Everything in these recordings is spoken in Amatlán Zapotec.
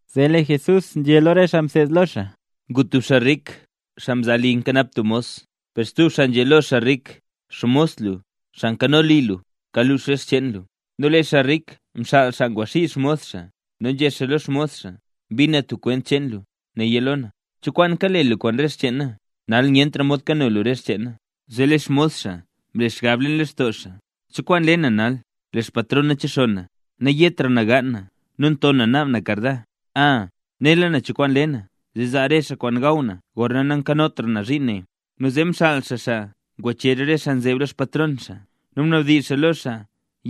Zee lee Jesús nzhé lo re xaa mseed lo xaa: —Ngu tub xaa rik, xaa mzaa li nkanap tub xmos. Per stub xaa nzhé lo xaa rik: “Xmos lu, xaa nkano li lu, kalux re xcheen lu”. Nu lee xaa rik mxaal xaa ngwaxii xmos xaa, nu nzhé xaa lo xmos xaa: “Mbin na tub kwent cheen lu. Néya lo na. ¿Cho kwaan kale lu kwaan re xcheen na? Nal nyentra mod kano lu re xcheen na.” Zee lee xmos xaa mle xgab leen lextoo xaa: “¿Cho kwaan le na nal, lee xpatron na chexonn na? Nayetra na gaan na nu nton na naab na karda. A, nela na cho kwaan le na zee zaa re xaa kwaan gaw na gorna nankanotra na zhiin ne.” Nu zee mxaal xaa xaa ngwachezh re xaa nzeb lo xpatron xaa nu mnabdizh xaa lo xaa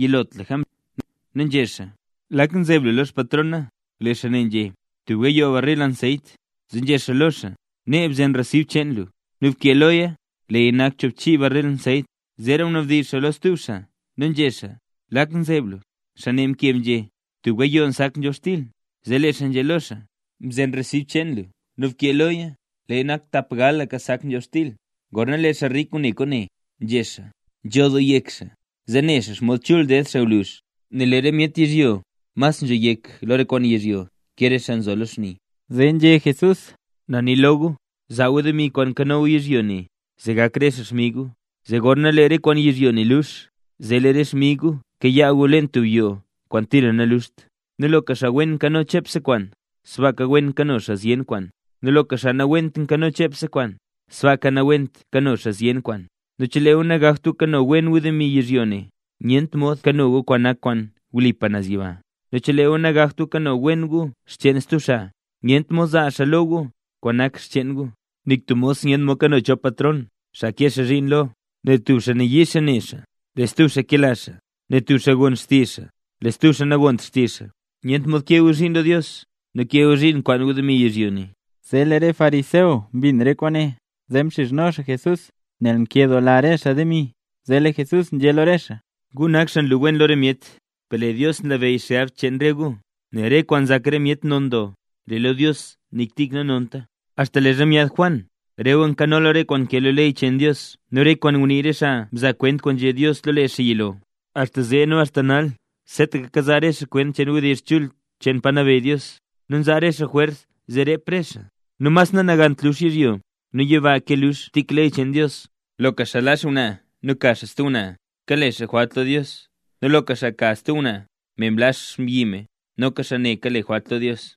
yilotlaka mzhin nu nzhé xaa: “¿Lak nzeb lu lo xpatron na?” Lee xaa ne nzhé: “Tub gayoo barril anseyt”. Zee nzhé xaa lo xaa: “Nee, bzen resib cheen lu, nu bkee loya, leeya nak choobchiika barril anseyt”. Zeera mnabdizh xaa lo stub xaa nu nzhé xaa: “¿Lak nzeb lu?” Xaa ne mkeb nzhé: “Tub gayoo sak nzhobxtil”. Zee lee xaa nzhé lo xaa: “Bzen resib cheen lu nu bkee loya leeya nak tapgalka sak nzhobxtil”. Gorna lee xaa rik ngune kwaane, nzhé xaa: “Nzho doo yek xaa, zee ne xomod chul ded xaa gwluzh”. Nel lee re myet yizhyo mas nzho yek lo re kwaan yizhyo ke re xaa nzo lo xni. Zee nzhé Jesús: —Na nii lo gu, zaa gu demi kwaan nkano gu yizhyo ne, zee gak re xaa xmig gu. Zee gorna lee re kwaan yizhyo ne lux, zee lee re xmig gu kayaa gu leen tub yoo kwaan tira naluxt. Nu loka xaa wen nkano chepse kwaan, sbaaka wen kano xaa zyen kwaan; nu loka xaa nawent nkano chepse kwaan, sbaaka nawent nkano xaa zyen kwaan. Nu chelee gu nagakt gu kano wen gu demi yizhyo ne, nyent mod nkano gu kwaan nak kwaan wlipa naz yiba. Nu chelee gu nagakt gu kano wen gu xcheen stub xaa, nyent mod zaa xaa lo gu kwaan nak xcheen gu. Nik tub mos nyent mod kano chop patron xaa kee xaa zhiin lo, nel tub xaa yii ne xaa lee stub xaa kela xaa, nel tub xaa gon xaa xtizh, lee stub xaa nagont xaa xtizh. Nyent mod kee gu zhiin lo Dios nu kee gu zhiin kwaan gu demi yizhyo ne. Zee lee re xaa fariseo mbin re kwaane zee mxizhno xaa Jesús nel nkedoola re xaa demi. Zee lee Jesús nzhé lo re xaa: —Gu nak xaa nlu wen lo re myet, per lee Dios nlabeyy xgab cheen re gu; nel re kwaan nzak re myet non doo, lee lo Dios nik tik nanonta. ’Axta leezha myaad Juan, re gu nkanola re kwaan nkee lo ley cheen Dios nu re kwaan ngunii re xaa mzaa kwent kwaan nzhé Dios lo lee xaa yilo. Axta zee nu axta nal seetaka kazaa re xaa kwent cheen wdizh chul cheen pa nabeyy Dios, nu nzaa re xaa jwers zee rep re xaa. Nu mas nanagant lux yizhyo nu yiba ke lux tik ley cheen Dios. ’Loka xaa laa xngwnaa nu ka xaa stub ngwnaa, kale xaa jwalt lo Dios; nu loka xaa ka tub ngwnaa, me mlaa xmbyi me, noka xaa ne kale jwalt lo Dios.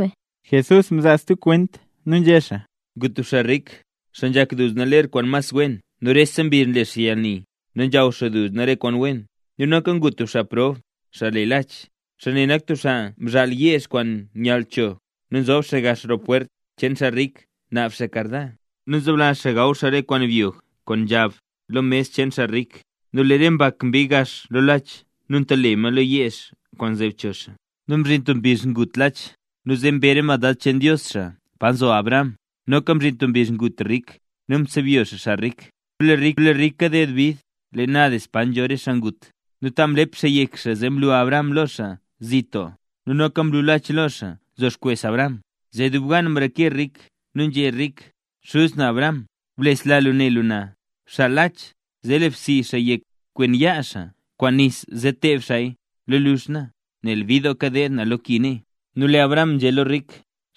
Jesús mzaa stub kwent nu nzhé xaa: —Ngu tub xaa rik, xaa nzhak duzna ler kwaan mas wen nu rese mbizh nle xaa yalni nu nzhaw xaa duzna re kwaan wen. Nu noka ngu tub xaa prob, xaa le Lach. Xaa ne nak tub xaa mzhaal yeezh kwaan nyall cho nu nzob xaa gax roo pwert cheen xaa rik naab xaa karda. Nu nzoblazh xaa gaw xaa re kwaan byog kwaan nzhab lo mes cheen xaa rik. Nu lee re mbak mbii gax lo Lach nu ntale ma lo yeezh kwaan nzeb cho xaa. Nu mzhin tub mbizh ngut Lach nu zee mbe re mandad cheen Dios xaa pa nzho Abraham. Noka mzhin stub mbizh ngut rik nu msebyo xaa rik. ’Nu lee rik kaded doo bid leen Hades pa nzho re xaa ngut, nu ta mlep xaa yek xaa zee mlu Abraham lo xaa zit doo; nu noka mlu Lach lo xaa nzo xkwes Abraham. Zee dub gan mrazhe rik nu nzhé rik: “Xuz na Abraham, blesla lu ne lu na. Bxaal Lach zee le bsii xaa yek kwen yaa xaa kwaan nis zee teeb xaaya lo luzh na, nel bid doo kadeed na lo ki nee.” Nu lee Abraham nzhé lo rik: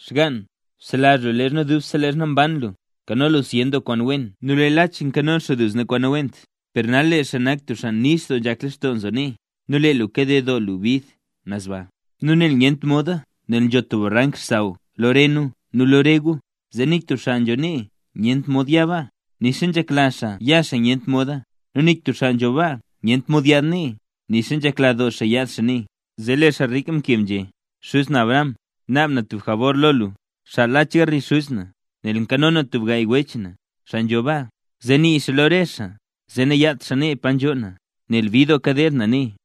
“Xgann, bselazh lu leezha dubse leezha mban lu, mkano lu zyen doo kwaan wen nu lee Lach mkano duzna kwaan nawent. Per nal lee xaa nak xaa nix doo nzhak lextoo nzo nee, nu lee lu kaded doo bid naz baa. Nu nel nyent moda nel nzho tub barank xsaww lo re nu nu lo re gu, zee nik tub xaa nzho nee nyent mod ya baa, nixa nzhekla xaa ya xaa nyent moda; nu nik tub xaa nzho baa nyent mod yaad nee, nixa nzhekla doo xaa yaad xaa nee.” ’Zee lee rik mkeb nu nzhé: “Xuz na Abraham, naab na tub jabor lo lu, xaal Lach garli xuz na, nel nkano na tub gaay wech na, xaa nzho baa, zee nii xaa lo re xaa zee nayat xaa nee pa nzhoo na, nel bid doo kadeed na nee”.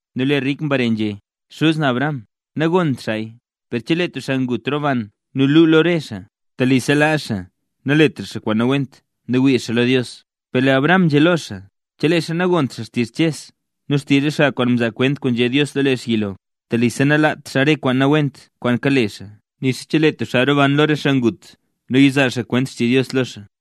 Nu lee rik mbare nzhé: “Xuz na Abraham, nagont xaaya, per chelee tub xaa ngut roban nu lu xaa lo re xaa, telisa laa xaa naletra xaa kwaan nawent nu wii xaa lo Dios”. Per lee Abraham nzhé lo xaa: “Chelee xaa nagont xtizh Ches nu xtizh re xaa mzaa kwent kwaan nzhé Dios lo lee xaa yilo, telisa nalaat xaa re kwaan nawent kwaan kale xaa nixa chelee tub xaa roban lo re xaa ngut nu yazaa kwent xtizh Dios lo xaa”.